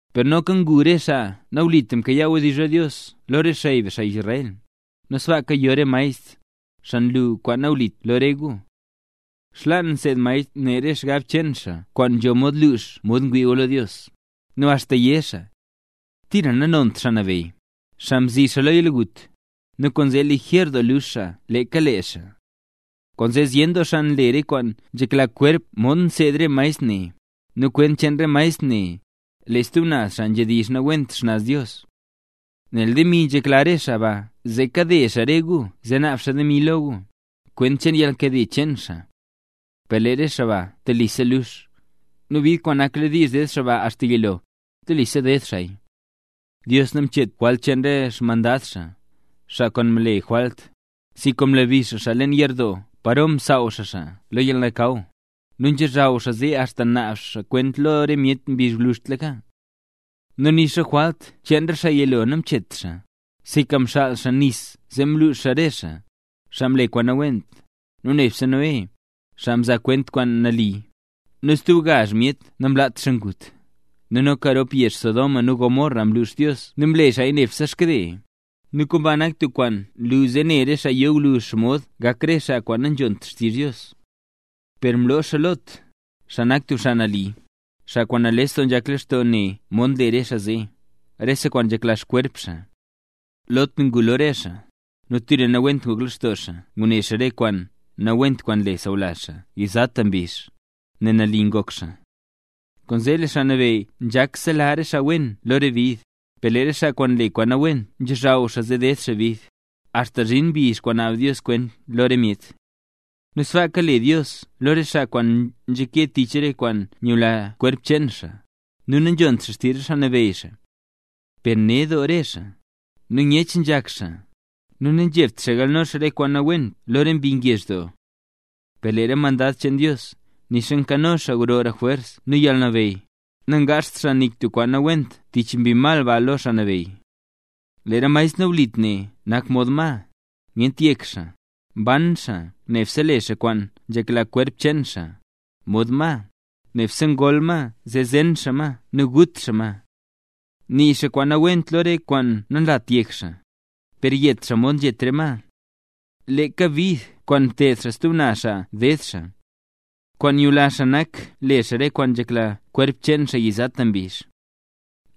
Per noka ngu re xaa nawlit mkayaa wdizh lo Dios lo re xey be, xaa Israel; nu sbaaka yo re maestr, xaa luu kwaan nawlit lo re gu. Xlaan seed maestr ne re xgab cheen xaa kwaan nzho mod lux mod ngwii gu lo Dios, nu axta yé xaa: “Tira nanont Xaa Nabeyy”, xaa mzi be lo yalgut, nu kwaane le lijer doo lux xaa leeka lee xaa. Kwaanzee zyen doo xaa nle re kwaan nzhekla xkwerp modxa nseed re maestr ne; nu kwent cheen re maestr ne, le stub naz xaa nzhedizh nawent xnaz Dios. Nel demi nzhekla re xaa ba zee kade xaa re gu zee naab xaa demi lo gu, kwent cheen yalnkade cheen xaa. Per lee re xaa ba telisa lux, nu bid kwaan nakladiizh ded xaa ba axta yilo, telisa ded xaaya. Dios namchet jwalt cheen re xmandad xaa, xaa kwaan mle jwalt, sinka mlabi xaa xaa leen yerdoo paro msaaw xaa xaa lo yalnakaw, nu nzhochaw xaa zee axta naab xaa kwent lo re myet mbizh gwluzhtlaka. Nu nixa jwalt cheen re xaa yilo namchet xaa, sinka mxaal xaa nis zee mluuxa re xaa, xaa mle kwaan nawent; nu nebse Noé, xaa mzaa kwent re kwaan nali, nu stub gazh myet namlaat xaa ngut. Nu noka rop yezh Sodoma nu Gomorra mlux Dios nu mle xaaya nebse xkade, nu kwaan ba nak tub kwaan nlu zee ne re xaa yo gwluzh xomod gak re xaa kwaan nanzhont xtizh Dios. Per mloo xaa Lot, xaa nak tub xaa nali, xaa kwaan nales doo nzhak lextoo ne mod nle re xaa zee, rese kwaan nzhekla xkwerp xaa. Lot ngu lo re xaa zee, nu tira nawent ngok lextoo xaa ngune xaa re kwaan nawent kwaan nle sawlazh xaa yizata mbizh, nel nali ngok xaa. Kwaanzee lee Xaa Nabeyy nzhak sela re xaa wen lo re bid, per lee re xaa kwaan nle kwaan nawent nzhozhaw xaa, zee deed xaa bid axta zhin mbizh kwaan naab Dios kwent lo re myet. Nu sbaaka le Dios lo re xaa kwaan nzhake tich re kwaan nyula kwerp cheen xaa, nu nanzhont xaa xtizh re xaa nabeyy xaa. Per ned doo re xaa, nu nyech nzhak xaa, nu nanzhebt xaa galno xaa re kwaan nawent lo re mbi ngezh doo. Per lee re mandad cheen Dios, nixa nkano xaa grora jwers nu yalnabeyy, nangaazht xaa nik tub kwaan nawent tich mbi mal ba lo Xaa Nabeyy. Lee re maestr nawlit ne nak mod ma, nyent yek xaa, mban xaa nebse le xaa kwaan nzhekla kwerp cheen xaa; mod ma, nebse ngol ma zee zen xaa ma nu gut xaa ma. Nii xaa kwaan nawent lo re kwaan nanlat yek xaa, per yet xaa mod nzhetaka re ma. Leeka bid kwaan mted xaa stub xaa ded xaa. Kwaan nyula xaa nak le xaa re kwaan nzhekla kwerp cheen xaa yizata mbizh.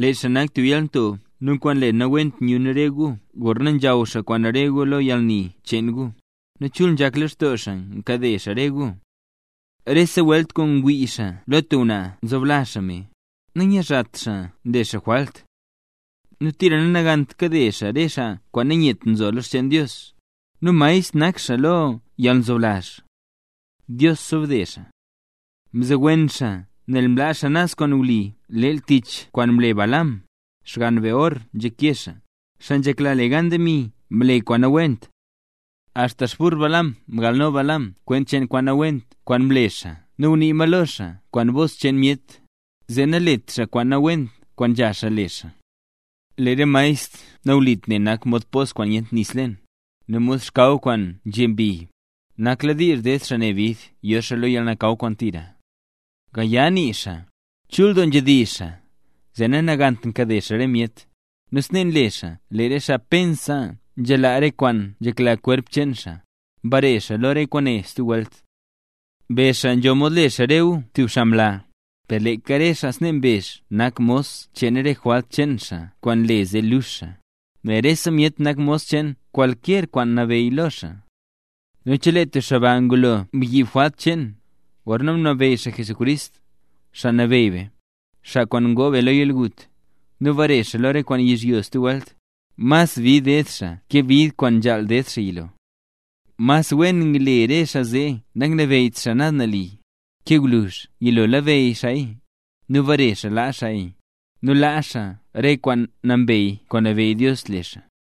Lee xaa nak tub yalnto nu kwaan nle nawent nyun re gu gorna nzhaw xaa kwaan re gu lo yalni cheen gu, nu chul nzhak lextoo xaa nkade xaa re gu. Rese welt ngwii xaa lo tub ngwnaa nzoblazh xaa me; nanyizhat xaa nle xaa jwalt. Nu tira nanagant nkade xaa re xaa kwaan nanyet nzo lo re xcheen Dios, nu maestr nak xaa lo yalnzoblazh. Dios xobde xaa. Mzowen xaa nel mlaa xaa naz kwaan wli leel tich kwaan mle Balaam, xgann Beor nzhake xaa, xaa nzhekla le gan demi mle kwaan nawent. Axta xburr Balaam mgalno Balaam kwent cheen kwaan nawent kwaan mle xaa nu ngunii ma lo xaa kwaan bos cheen myet, zee nalet xaa kwaan nawent kwaan nzha xaa le xaa. Lee re maestr nawlit ne nak mod pos kwaan nyent nis leen, nu mod xkaw kwaan nzhe mbi; nakladiizh ded xaa ne bid yo xaa lo yalnakaw kwaan tira. Gaya nii xaa, chul doo nzhedizh xaa, zee nanagant kade xaa re myet, nu snee nle xaa lee re xaa pensa nzhalaa re kwaan nzhekla xkwerp, mbare lo re kwaane stub welt. Mbezh xaa nzho mod le xaa re gu tub xaa mla, per leeka re xaa snee mbezh nak mos cheen re jwalt cheen xaa kwaan nle zee luux xaa; nel rese myet nak mos cheen kwalkyer kwaan nabeyy lo xaa. Nu chelee tub xaa ba, ngulo mbyiib jwalt cheen, gorna mlabeyy xaa Jesucrist, Xaa Nabeyy be, xaa kwaan ngoo be lo yalgut, nu bare xaa lo re kwaan yizhyo stub welt, mas bid ded xaa ke bid kwaan nzhaal ded xaa yilo. Mas wen ngle re xaa zee nanglabeyyt naz nali, ke gwluzh yilo labeyy xaaya, nu bare xaa laa xaaya, nu laa xaa re kwaan nambey kwaan nabeyy Dios le xaa.